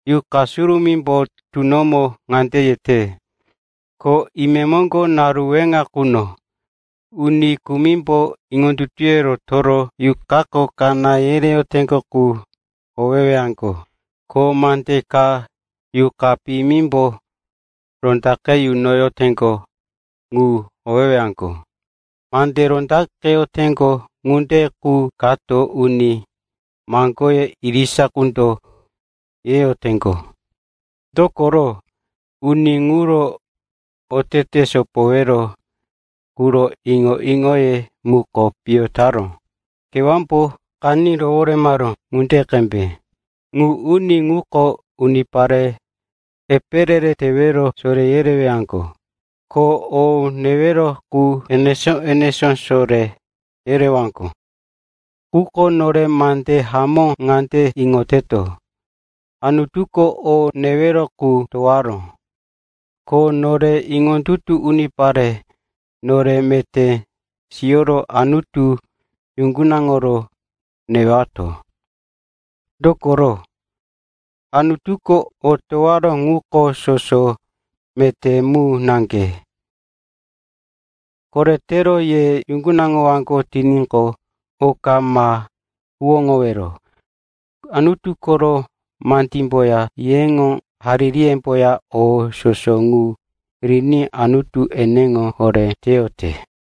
Yuqa Surumímbo tunomo ŋande yete, ko imemoŋgo, naru weŋa quno, uni kumimbo iŋondutuye rotoro yuqako kaná yereyoteŋgo qu yohowewaŋgo, ko mande ka yuqa piyimimbo rondaqe yunoyoteŋgo ŋu howewaŋgo. Mande rondaqeyoteŋgo ŋunde qu kota uni maŋgoye irisa qundo yeyoteŋgo, dokoro uni ŋuro otete sopowero quro iŋo-iŋoye muko piyo taró, kewámbo qaní roworemaró ŋunde qembe. Ŋu uni ŋuko unipare epe re-re tewero soré yereyowaŋgo, ko o newero qu enesó-enesó soré yereyowaŋgo. Quko nore mande hamó ŋande iŋoteto, Anutuko o newero ŋu towaró, ko nore iŋondutu unipare, nore meté siyoro Anutu yuŋgunaŋoro newato. Dokoro, Anutuko o towaró ŋuko soso meté mu naŋge. Koretero ye yuŋgunaŋowaŋgo tiníqo, oka ma huwóŋowero. Anutu koro mandímboya yeŋo haririyemboya o soso ŋu riní Anutu eneŋo horé teyote.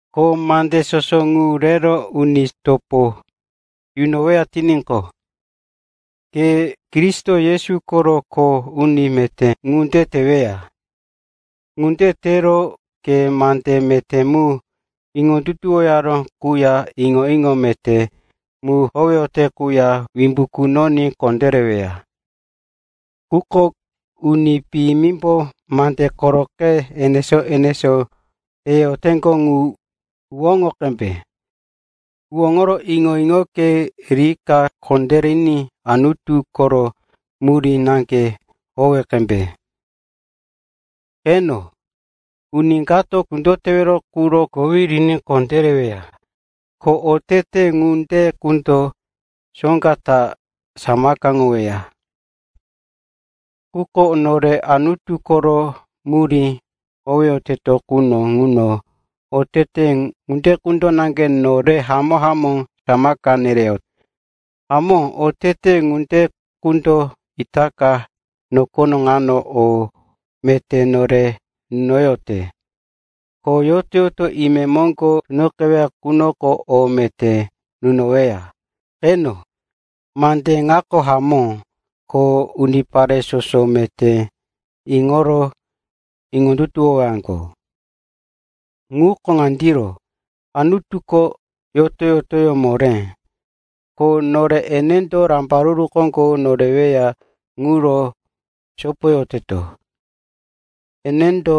Ko mande soso ŋu rero uni topo yunoweya tiníqo, ke Kristo Yesu koro kho uni meté ŋunde teweya. Ŋunde tero ke mande meté mu iŋondutuwoyaró quya iŋo-iŋo meté mu howeyote quya wimbu kunoní kondéreweya. Quko uni piyimimbo mande koroqe enesó-enesó yeyoteŋgo ŋu huwóŋo qembe. Huwóŋoro iŋo-iŋoke rika kondériní Anutu koro murí naŋge howe qembe. Qeno, uni kato kundo tewero quro kowí riní kondéreweya, ko otete ŋunde qundo soŋga ta samakaŋoweya. Quko nore Anutu koro murí howeyoteto quno ŋuno otete ŋunde qundo naŋge nore hamó-hamó samaka nereyote. Hamó, otete ŋunde qundo itaka nokono ŋano o meté nore nunoyote, ko yoto-yoto imemoŋgo tunoqeweya ŋunoko o meté nunoweya. Qeno, mande ŋako hamó ko unipare soso meté iŋoro iŋondutuwowaŋgo. Ŋuko ŋandiro: Anutuko yoto-yotoyó moré, ko nore enendo rambaruru koŋgo noreweya ŋuro sopoyoteto. Enendo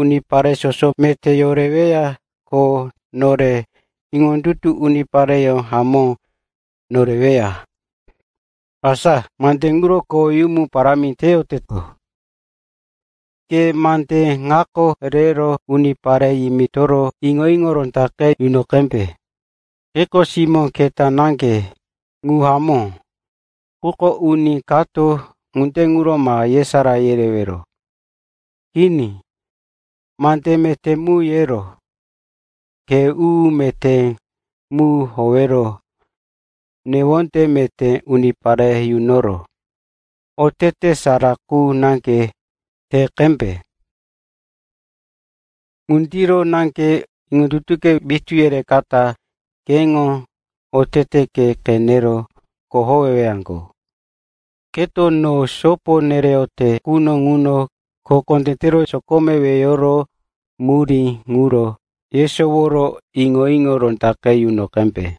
unipare soso meté yoreweya, ko nore iŋondutu unipareyó hamó noreweya. Asa mande ŋuro koweyumu parámi teyoteto. Ke mande ŋa rero unipare yimitoro iŋo-iŋo rondaqe yuno qembe. Keko simó keta naŋge, ŋu hamó. Quko uni kato ŋunde ŋuro ma yesará kerewero. Kini, mande meté mu yero, khe u-u meté mu howero, newonde meté unipare yunoro, otete sara qu naŋge te qembe. Ŋundiro naŋge iŋondutuke witú yirikata keŋo oteteke qenero kohowewaŋgo. Keto no sopo nereyote quno ŋuno, kho kondé tero sokome weyoro murí ŋuro yesoworo iŋo-iŋo rondaqe yuno qembe.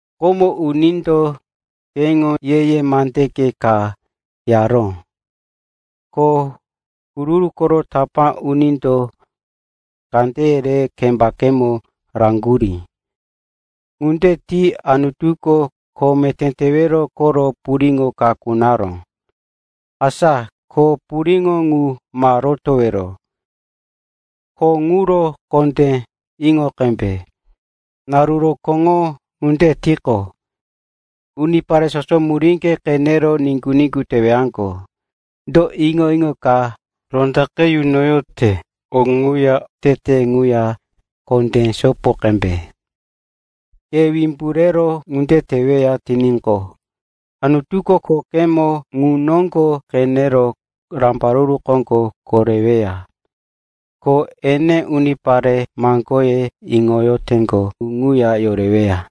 Komo unindo keŋo ye-ye mande ka yaró, ko huru-huru koro tapá unindo kandeye re kembakemo raŋgurí. Ŋunde ti Anutuko kho meté tewero koro puriŋo ka kunaró. Asa ko puriŋo ŋu ma rotowero. Kho ŋuro kondé iŋo qembe. Naru rokóŋo ŋunde tiqo, unipare soso muríŋge qenero niŋgu-niŋgu tewaŋgo. Do iŋo-iŋo ka rondaqe yunoyote ŋuya oteteke ŋuya kondé sopo qembe. Ke wimbu rero ŋunde teweya tiníqo, Anutuko khokemo ŋu noŋgo qenero rambaruru koŋgo koreweya, ko ene unipare maŋgoke iŋoyoteŋgo ŋu ŋuya yoreweya.